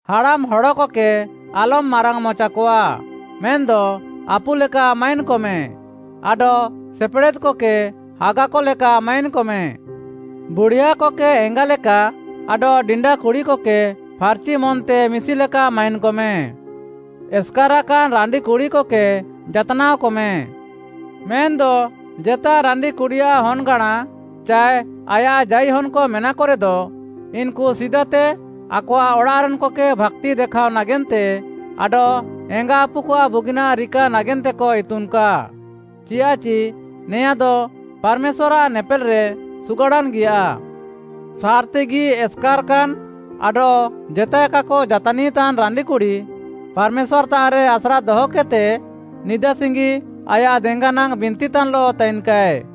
ହାଡ଼ାମ୍ ହଡ଼କକେ ଆଲମ୍‌ ମାରାଙ୍ଗ୍‌ମଚାକଆ, ମେନ୍‌ଦ ଆପୁଲେକା ମାଇନ୍‌କମେ ଆଡଃ ସେପେଡ଼େଦ୍‌କକେ ହାଗାକଲେକା ମାଇନ୍‌କମେ। ବୁଢ଼ିଆକକେ ଏଙ୍ଗାଲେକା ଆଡଃ ଡିଣ୍ଡା କୁଡ଼ିକକେ ଫାର୍‍ଚି ମନ୍‌ତେ ମିଶିଲେକା ମାଇନ୍‍କମେ। ଏସ୍‌କାରାକାନ୍‌ ରାଣ୍ଡିକୁଡ଼ିକକେ ଯାତ୍‌ନାଅକମେ। ମେନ୍‌ଦ ଜେତା ରାଣ୍ଡିକୁଡ଼ିଆଃ ହନ୍‌ଗାଁଣା ଚାଏ ଆୟାଃ ଜାଇହନ୍‌କ ମେନାକରେଦ, ଇନ୍‌କୁ ସିଦାତେ ଆକଆଃ ଅଡ଼ାଃରେନ୍‌କକେ ଭାକ୍ତି ଦେଖାଅ ନାଗେନ୍ତେ ଆଡଃ ଏଙ୍ଗାଆପୁକଆଃ ବୁଗିନାଃ ରିକା ନାଗେନ୍ତେକ ଇତୁନ୍‌କା, ଚିୟାଃଚି ନେଆଁଦ ପାର୍‌ମେଶ୍ୱାର୍‌ଆଃ ନେପେଲ୍‌ରେ ସୁଗାଡ଼ାନ୍‌ଗିଆ। ସାର୍‌ତିଗି ଏସ୍‌କାର୍‌କାନ୍‌ ଆଡଃ ଜେତାଏ କାକ ଜାତାନିତାନ୍‌ ରାଣ୍ଡିକୁଡ଼ି, ପାର୍‌ମେଶ୍ୱାର୍‌ତାଃରେ ଆସ୍ରା ଦହକେଦ୍‌ତେ ନିଦା ସିଙ୍ଗି ଆୟାଃ ଦେଙ୍ଗାନାଙ୍ଗ୍‌ ବିନ୍ତିତାନ୍‍ଲଃ ତାଇନ୍‌କାଏ।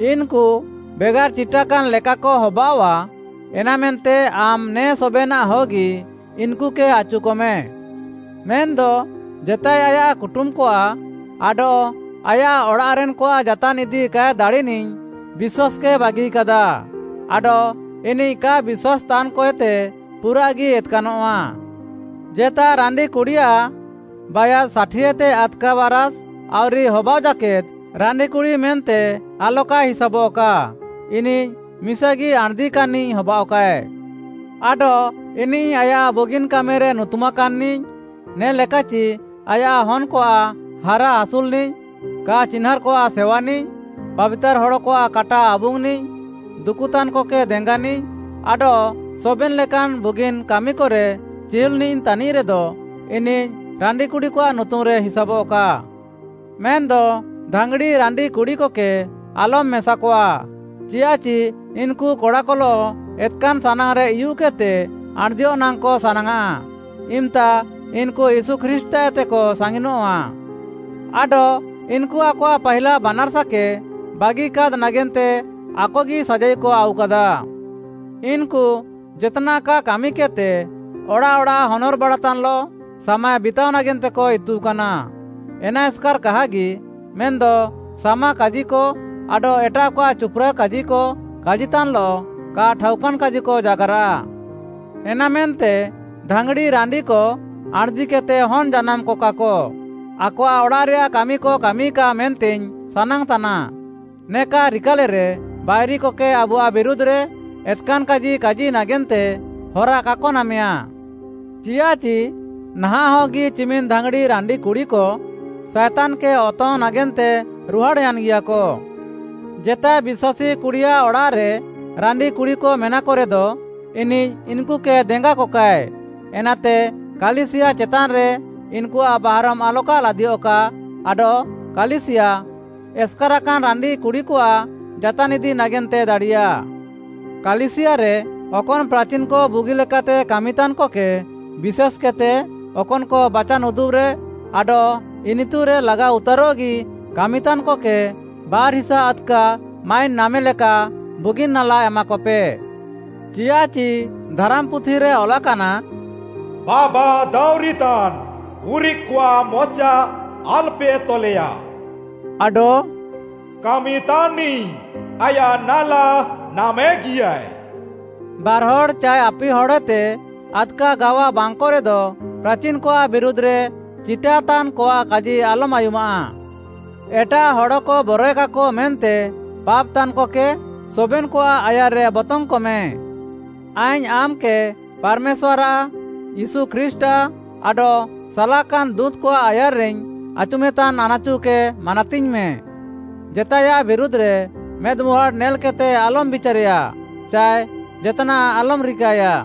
ଇନ୍‌କୁ ବେଗାର୍‌ ଚିଟାକାନ୍‌ ଲେକାକ ହବାଅଃଆ, ଏନାମେନ୍ତେ ଆମ୍‌ ନେ ସବେନାଃହଗି ଇନ୍‌କୁକେ ଆଚୁକମେ। ମେନ୍‌ଦ ଜେତାଏ ଆୟାଃ କୁଟୁମ୍‍କଆଃ ଆଡଃ ଆୟାଃ ଅଡ଼ାଃରେନ୍‌କଆଃ ଯାତାନ୍ ଇଦି କାଏ ଦାଡ଼ିନିଃ ବିଶ୍ୱାସ୍‍କେ ବାଗିକାଦା ଆଡଃ ଇନିଃ କା ବିଶ୍ୱାସ୍‌ତାନ୍‍କଏତେ ପୁରାଃଗି ଏତ୍‌କାନଃଆ। ଜେତା ରାଣ୍ଡିକୁଡ଼ିଆଃ ବାୟାସ୍‌ ଷାଠିଏତେ ଆଦ୍‌କା ବାରାଷ୍ ଆଉରି ହବାଅଃ ଜାକେଦ୍‌ ରାଣ୍ଡିକୁଡ଼ି ମେନ୍ତେ ଆଲକାଏ ହିସାବଃକା, ଇନିଃ ମିସାଗି ଆଣ୍‌ଦିକାନ୍‌ନିଃ ହବାଅଃକାଏ। ଆଡଃ ଇନିଃ ଆୟାଃ ବୁଗିନ୍‌ କାମିରେ ନୁତୁମାକାନ୍‌ନିଃ, ନେ'ଲେକାଚି ଆୟାଃ ହନ୍‌କଆଃ ହାରାଆସୁଲ୍‌ନିଃ, କା ଚିହ୍ନାଁର୍‌କଆଃ ସେୱାନିଃ, ପାବିତାର୍‌ ହଡ଼କଆଃ କାଟା ଆବୁଙ୍ଗ୍‌ନିଃ, ଦୁକୁତାନ୍‍କକେ ଦେଙ୍ଗାନିଃ ଆଡଃ ସବେନ୍‌ ଲେକାନ୍‌ ବୁଗିନ୍‌ କାମିକରେ ଚିହୁଲ୍‌ନିଃ ତାନିଃରେଦ, ଇନିଃ ରାଣ୍ଡିକୁଡ଼ିକଆଃ ନୁତୁମ୍‌ରେ ହିସାବଃକା। ମେନ୍‌ଦ ଧାଙ୍ଗ୍‌ଡ଼ି ରାଣ୍ଡିକୁଡ଼ିକକେ ଆଲମ୍‌ ମେସାକଆ, ଚିୟାଃଚି ଇନ୍‌କୁ କଡ଼ାକଲଃ ଏତ୍‌କାନ୍‌ ସାନାଙ୍ଗ୍‌ରେ ଉୟୁଃକେଦ୍‌ତେ ଆଣ୍‌ଦିୟଃ ନାଙ୍ଗ୍‌କ ସାନାଙ୍ଗ୍‌ଆଃ, ଇମ୍‌ତା ଇନ୍‌କୁ ୟୀଶୁ ଖ୍ରୀଷ୍ଟ୍‌ତାଃଏତେକ ସାଙ୍ଗିନଃଆ। ଆଡଃ ଇନ୍‌କୁ ଆକଆଃ ପାହିଲା ବାନାର୍‌ସାକେ ବାଗିକାଦ୍‌ ନାଗେନ୍ତେ ଆକଗି ସାଜାଇକ ଆଉକାଦା। ଇନ୍‌କୁ ଜେତ୍‌ନାଃ କା କାମିକେଦ୍‌ତେ ଅଡ଼ାଃ ଅଡ଼ାଃ ହନର୍‌ବାଡ଼ାତାନ୍‌ଲଃ ସାମାଏ ବିତାଅ ନାଗେନ୍ତେକ ଇତୁକାନା, ଏନା ଏସ୍‍କାର୍‍ କାହାଗି, ମେନ୍‌ଦ ସାମାକାଜିକ ଆଡଃ ଏଟାଃକଆଃ ଚୁପ୍‌ରା କାଜିକ କାଜିତାନ୍‍ଲଃ କା ଠାଉକାନ୍‌ କାଜିକ ଜାଗାର୍‌ରାଃ। ଏନାମେନ୍ତେ ଧାଙ୍ଗ୍‌ଡ଼ି ରାଣ୍ଡିକ ଆଣ୍‌ଦିକେଦ୍‌ତେ ହନ୍‌ ଜାନାମ୍‍କକାକ, ଆକଆଃ ଅଡ଼ାଃରେୟାଃ କାମିକ କାମିକା, ମେନ୍ତେଇଙ୍ଗ୍‌ ସାନାଙ୍ଗ୍‌ତାନା, ନେକା ରିକାଲେରେ ବାଇରିକକେ ଆବୁଆଃ ବିରୁଧ୍‌ରେ ଏତ୍‌କାନ୍‌ କାଜି ନାଗେନ୍ତେ ହରା କାକ ନାମେୟା। ଚିୟାଃଚି ନାହାଁଃହଗି ଚିମିନ୍‌ ଧାଙ୍ଗ୍‌ଡ଼ି ରାଣ୍ଡିକୁଡ଼ିକ ସାଏତାନ୍‌କେ ଅତଙ୍ଗ୍‌ ନାଗେନ୍ତେ ରୁହାଡ଼୍‌ୟାନ୍‌ଗିଆକ। ଜେତାଏ ବିଶ୍ୱାସୀ କୁଡ଼ିଆଃ ଅଡ଼ାଃରେ ରାଣ୍ଡିକୁଡ଼ିକ ମେନାକରେଦ, ଇନିଃ ଇନ୍‌କୁକେ ଦେଙ୍ଗାକକାଏ। ଏନାତେ କାଲିସିୟା ଚେତାନ୍‌ରେ ଇନ୍‌କୁଆଃ ବାହାରମ୍‍ ଆଲକା ଲାଦିୟଃକା, ଆଡଃ କାଲିସିୟା, ଏସ୍‌କାରାକାନ୍‌ ରାଣ୍ଡିକୁଡ଼ିକଆଃ ଯାତାନ୍‌ ଇଦି ନାଗେନ୍ତେ ଦାଡ଼ିୟା। କାଲିସିୟାରେ ଅକନ୍‌ ପ୍ରାଚିନ୍‌କ ବୁଗିଲେକାତେ କାମିତାନ୍‌କକେ, ବିଶେଷ୍‌କେଦ୍‌ତେ ଅକନ୍‌କ ବାଚାନ୍‌ ଉଦୁବ୍‌ରେ ଆଡଃ ଇନିତୁରେ ଲାଗାଉତାରଃଗି କାମିତାନ୍‌କକେ ବାର୍‌ ହିସା ଆଦ୍‌କା ମାଇନ୍‌ ନାମେଲେକା ବୁଗିନ୍‌ ନାଲା ଏମାକପେ। ଚିୟାଃଚି ଧାରାମ୍‌ପୁଥିରେ ଅଲାକାନା, “ବାବା ଦାଉଁରିତାନ୍‌ ଉରିଃକ୍‌କଆଃ ମଚା ଆଲ୍‌ପେ ତଲେୟା,” ଆଡଃ “କାମିତାନ୍‌ନିଃ ଆୟାଃ ନାଲା ନାମେଗିୟାଏ।” ବାର୍‌ହଡ଼୍‌ ଚାଏ ଆପିହଡ଼୍‌ଏତେ ଆଦ୍‌କା ଗାୱା ବାଙ୍ଗ୍‌କରେଦ, ପ୍ରାଚିନ୍‌କଆଃ ବିରୁଧ୍‌ରେ ଚିଟାତାନ୍‍କଆଃ କାଜି ଆଲମ୍‌ ଆୟୁମାଃ। ଏଟାଃ ହଡ଼କ ବରଏକାକ ମେନ୍ତେ ପାପ୍‌ତାନ୍‍କକେ ସବେନ୍‌କଆଃ ଆୟାର୍‌ରେ ବତଙ୍ଗ୍‌କମେ। ଆଇଙ୍ଗ୍‌ ଆମ୍‌କେ ପାର୍‌ମେଶ୍ୱାର୍‌ଆଃ, ୟୀଶୁ ଖ୍ରୀଷ୍ଟ୍‌ଆଃ ଆଡଃ ସାଲାକାନ୍‌ ଦୁଁତ୍‌କଆଃ ଆୟାର୍‍ରେଇଙ୍ଗ୍‌ ଆଚୁମେତାନ୍‌ ଆନାଚୁକେ ମାନାତିଙ୍ଗ୍‌ମେ। ଜେତାଏୟାଃ ବିରୁଧ୍‌ରେ ମେଦ୍‍ମୁହାଁଡ଼୍‌ ନେଲ୍‌କେଦ୍‌ତେ ଆଲମ୍‌ ବିଚାରେୟା ଚାଏ ଜେତ୍‌ନାଃ ଆଲମ୍‌ ରିକାୟା।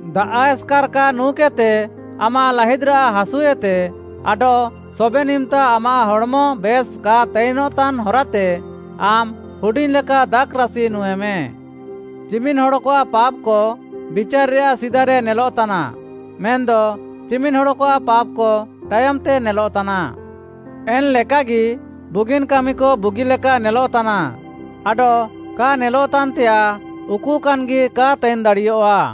ଦାଆଃ ଏସ୍‌କାର୍‌ କା ନୁଁକେଦ୍‌ତେ ଆମାଃ ଲାହିଦ୍‍ରାଃ ହାସୁଏତେ ଆଡଃ ସବେନ୍‌ ଇମ୍‌ତା ଆମାଃ ହଡ଼୍‌ମ ବେଶ୍‌ କା ତାଇନ୍‌ତାନ୍‌ ହରାତେ ଆମ୍‌ ହୁଡ଼ିଙ୍ଗ୍‌ଲେକା ଦାଖ୍‌ରାସି ନୁଁଇମେ। ଚିମିନ୍‍ ହଡ଼କଆଃ ପାପ୍‍କ ବିଚାର୍‌ରେୟାଃ ସିଦାରେ ନେଲଃତାନା ମେନ୍‌ଦ ଚିମିନ୍‌ ହଡ଼କଆଃ ପାପ୍‌କ, ତାୟମ୍‌ତେ ନେଲଃତାନା। ଏନ୍‌ଲେକାଗି ବୁଗିନ୍‌ କାମିକ ବୁଗିଲେକା ନେଲଃତାନା ଆଡଃ କା ନେଲଃତାନ୍‌ତେୟାଃ ଉକୁକାନ୍‌ଗି କା ତାଇନ୍‌ ଦାଡ଼ିୟଃଆ।